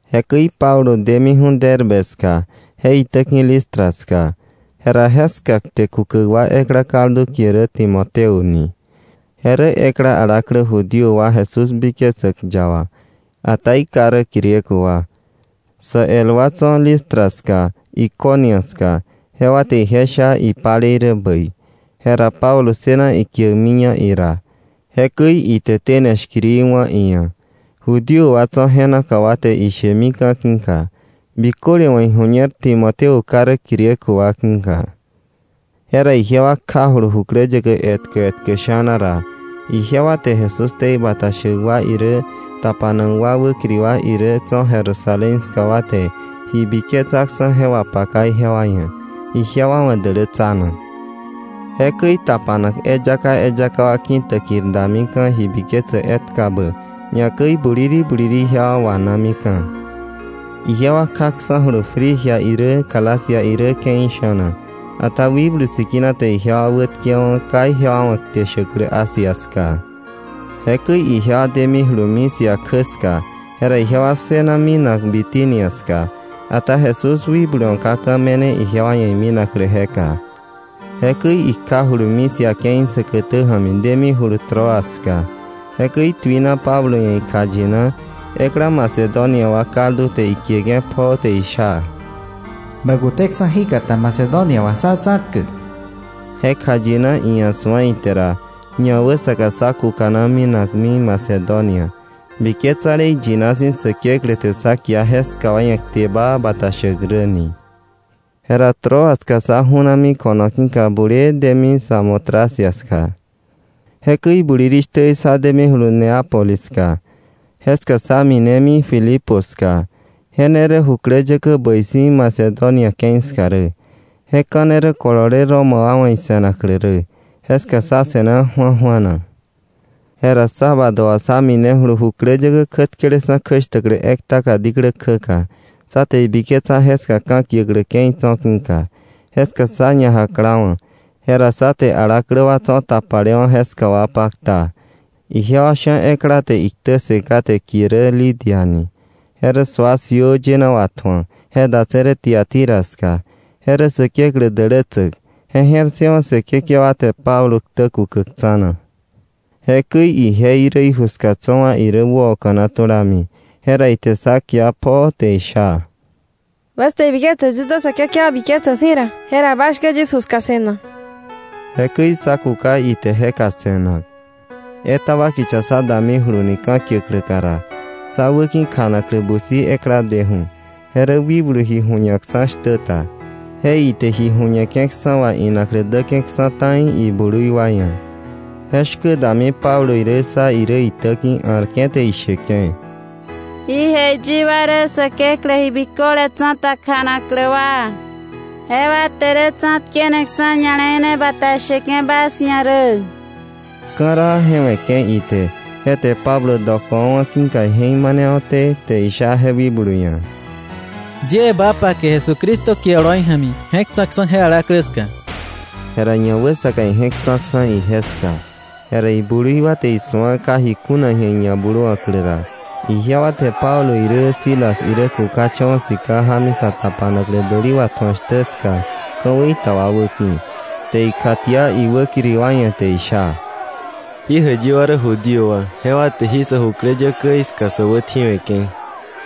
Jekäi Pablo demiju̱ Derbe ska, je itäki̱ Listra ska. Jera jeska kte kukäk ekla kaldu kie rä Timoteo ni. Je rä ekla alaklä Judío wa Jesús biketsäk yaba, ata iká rä Griego wa. Sä el wa tso̱ Listra ska, Iconio ska, jewa te ije sha ipalei rä bäi. Jera Pablo ssëna ikiäkmiña ira. Jekäi ite tene shkiri wá̱ iia̱, Judío wa tso̱ je naka wa te ishemika̱ ki̱ka, biköle wa̱ iju̱ñer Timoteo ká rä Griego wa ki̱ka. Jera ijewa kjajulu jukläyäkä etkä etkä sha̱na ra, ijewa te Jesús ktei bata shäk wa irä tapanak wa wäkiri wa irä tso̱ Jerusalén ska wa te ji biketsaksa̱ je wapaka ijewa ia̱, ijewa wa̱ dälätsanak. Jekäi tapanak eyaka eyaka wa ki̱täkir damika̱ ji biketsäk etkabä, ñakäi buliri buliri ijewa wanamika̱. Ijewa kjaksa̱julu Frigia irä Galacia irä ke̱i sha̱na, ata Wikblu Sikina te ijewa wätkewa̱wa̱ ka ijewa wa̱ kte shäklä Asia ska. Jekäi ijewa demijulu Misia kjä ska, jera ijewa ssëna minak Bitinia ska. Ata Jesús wikblu wa̱ ka ka̱ me̱ne ijewa ia̱ iminaklä jeka. Jekäi ikjajulu Misia ke̱i säkätä ja̱mi demijulu Troas ska. Jekäi tuina Pablo ia̱ ikjayina, ekla Macedonia wa kaldu te ikieke̱ pjoo te isha: “Bä kuteksa̱ jíkata Macedonia wà sá tsa̱tkäk.” Je kjayina iia̱ su̱a ite ra, ñawäsaka sá kukana minakmi Macedonia, biketsale iyina si̱ Säkeklä te sá kia jeska wa ia̱ kte baa bata shäk rä ni. Jera Troas ska sá ju̱nami ko̱no ki̱ka bulee demi Samotracia ska. Jekäi bulirishtä sá demijulu Neápolis ska. Jeska sá minemi Filipo ska. Je ne rä jukläyäkä bäi si̱ Macedonia ke̱i ska rä. Je ka̱ ne kolole Roma wa wa̱ ise̱naklä rä. Jeska sá se̱na ju̱aju̱ana. Jera sábado wà sá minejulumi jukläyäkä kjätkeleksa̱ kjäshtäklä ektaka diklä kjäka, sá te ibiketsa jeska ka̱kiäklä ke̱i tso̱ ki̱ka. Jeska sá ñajaklawa̱. Jera sá te alaklä wa tso̱ tapalewa̱ jeska wa pakta. Ijewa sha̱ ekla te iktä ssë kate kie rä Lidia ni. Je rä sua siöö yëna watju̱ak, je datse̱ Tiatira ska. Je rä Säkeklä dälätsäk. Je je̱r ssëwa̱ Säkekewa te Pablo ktä kukäk tsa̱na. Jekäi ije irä, iju ska tso̱ wa irä wäoka̱na tulami, jera ite sá kia pjoo, te isha: —Bas te ibiketse yis dä Säkekewa biketsäk si̱ ra, jera bas shkä yis ju ska se̱nak. Jekäi sá kuka ite jeka se̱nak. Etaba kicha sá damijuluni ka̱kiäkläka ra, sá wäki̱ kjanaklä busi ekla deju̱, je rä wikblu ji ju̱ñakksa̱ shtä ta. Je ite ji ju̱ñeke̱ksa̱ wà inaklä däke̱ksa̱ ta̱i iblui wa ia̱. Je shkä dami Pablo irä sá irä itäki̱, a̱rke̱ te isheke̱: —¡Jí jäiyi wa rä Säkeklä Ji Biköle Tsa̱ta kjanaklä wa! Jewa te tsa̱tkeneksa̱ ña̱le̱i ne bata sheke̱ bas ia̱ rä. Ka̱raa je we̱ke̱ ite. Je te Pablo dokowa̱wa̱ ki̱ka ije̱k manewa̱té, te isha je wikblu ia̱: —Yie ba pake Jesucristo kie oloi ja̱mi je̱k tsa̱ksa̱ je alaklä ska. Jera ñawäsaka ije̱k tsa̱ksa̱ ije ska. Jera iblui wa te isu̱a ka ji kuna ji̱a iñabluwa̱klä ra, ijewa te Pablo irä Silas irä kukacha̱wa̱ sika jámi sa tapanaklä däli watju̱ak shtä ska ka̱wei ta wa wäki̱, te ikjatia iwäkiri wa ia̱, te isha: —Jí jäiyi wa rä Judío wa, jewa te jí sä jukläyäkäí ska sä wätji̱we̱ke̱.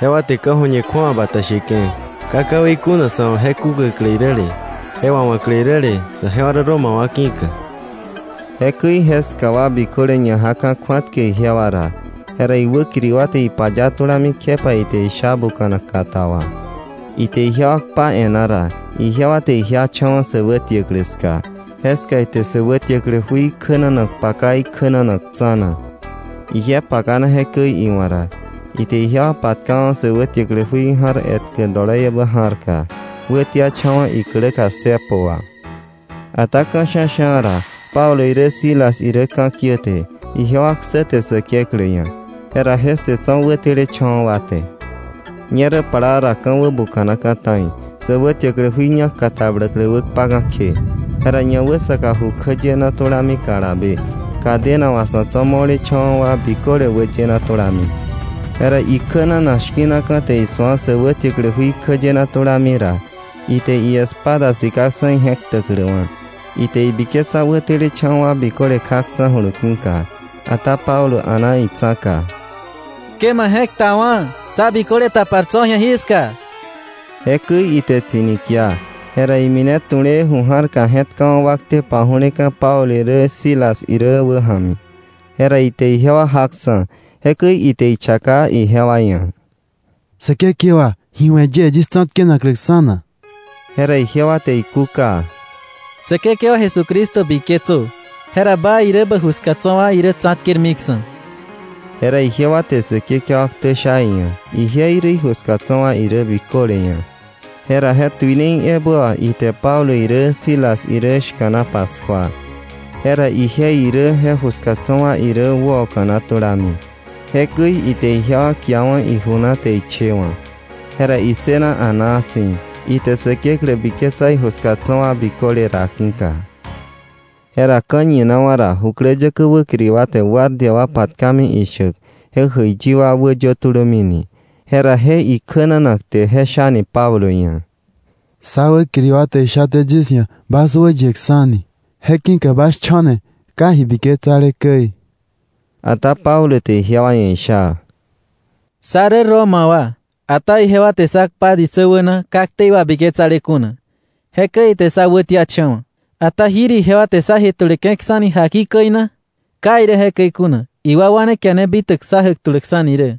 Jewa te ka̱ju̱ñe kju̱awa bata sheke̱, ka ka̱wei kuna sa̱ wa̱ je kukäklä iräle, je wawa̱klä iräle, sajewa rä Roma wa ki̱ka. Jekäi jeska wa biköle ñajaka̱ kju̱atkäk ijewa ra. Jera iwäkiri wa te ipaya tulami kjepa ite isha buka̱nak kata wà. Ite ijewa kpa e̱e̱na ra, ijewa te ijiacha̱wa̱ sä wätiäklä ska. Jeska ite sä wätiäklä jui kjänanak paka ikjänanak tsa̱na. Ije pakana jekäi iwa̱k ra, ite ijewa patkawa̱ sä wätiäklä jui ja̱r etkä doloiebä ja̱rka, wätiacha̱wa̱ ikläka cepo wà. Ata ka̱ sha̱sha̱ ra Pablo irä Silas irä ka̱kiäte, ijewa ksäte Säkeklä ia̱. Jera je ssë tso̱ wätelecha̱wa̱ wa te. Ñerä plaa ra ka̱ wäbuka̱naka̱ ta̱i, sä wätiäklä jui ñak katabläklä wäkpaka̱ kje. Jera ñawäsaka ju kjäyena tulami kalabe, cadena wà sa̱ tso̱ mo̱lecha̱wa̱ wa biköle wäyena tulami. Jera ikjänanak shki̱naka̱ te isu̱a sä wätiäklä jui kjäyena tulami ra, ite iespada sikaksa̱ ije̱k ktäkläwa̱, ite ibiketsa wätelecha̱wa̱ wa biköle kjaksa̱julu ki̱ka. Ata Pablo a̱na itsa̱ka: —Ke ma je̱k ktawa̱, sá biköle tapar tso̱ ji̱a jiska. Jekäi ite tsi̱ni kia. Jera imine tu̱lee ju ja̱rka je̱tkawa̱ wakte paju̱leka̱ Pablo irä Silas irä wäja̱mi. Jera ite ijewa jaksa̱. Jekäi ite ichaka ijewa ia̱: —Säkekewa, ¿ji we̱ yie yis tsa̱tkenakläksa̱ na? Jera ijewa te ikúka: —Säkekewa Jesucristo biketsö, jera ba irä bä ju ska tso̱ wa irä tsa̱tkermiksa̱. Jera ijewa te Säkekewa ktä sha iia̱, ije irä, iju ska tso̱ wa irä biköle ia̱. Jera je tuinei ebä wà ite Pablo irä Silas irä shka̱na paskua. Jera ije irä je ju ska tso̱ wa irä wäoka̱na tulami. Jekäi ite ijewa kiawa̱ iju na, te ichewa̱. Jera issëna a̱naa si̱, ite Säkeklä biketsa iju ska tso̱ wa biköle ra ki̱ka. Jera ka̱ñinawa̱ ra jukläyäkä wäkiri wa te guardia wa patkami ishäk: “Je jäiyi wa wäyö tulömi” ni. Jera je ikjänanak te je shani Pablo ia̱: —Sá wäkiri wa te ishaté yis ia̱ bas wäyeksa̱ni. Je ki̱ka bas cho̱ni ka ji biketsale käi. Ata Pablo te ijewa ia̱ isha: —Sá rä Roma wa, ata ijewa te sá kpa ditsä wäna ka ktei wabiketsale kuna, jekäi ite sá wätiacha̱wa̱. ¿Ata jir ijewa te sá jetuleke̱ksa̱ni jakika käi na? Ka irä jekäi kuna, iwakwa ne kiana bitäk sá jätuläksa̱ni rä.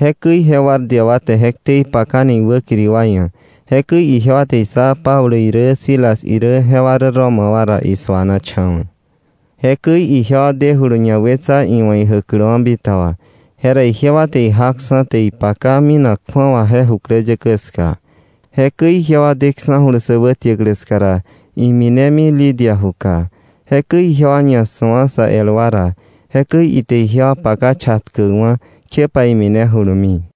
Jekäi je guardia wa te je ktei pakani iwäkiri wa ia̱. Jekäi ijewa te issá Pablo irä Silas irä jewa rä Roma wa ra, isuanacha̱wa̱. Jekäi ijewa dejulu ñawetsa iwa̱ ijäkläwa̱ bitaba. Jera ijewa te ijaksa̱, te ipaka minak kju̱awa je jukläyäkä ska. Jekäi ijewa deksa̱julu sä wätiäklä ska ra, iminemi Lidia juka. Jekäi ijewa ñasu̱a sa el wa ra, jekäi ite ijewa paka chatkäkwa̱, kjepa iminejulumi.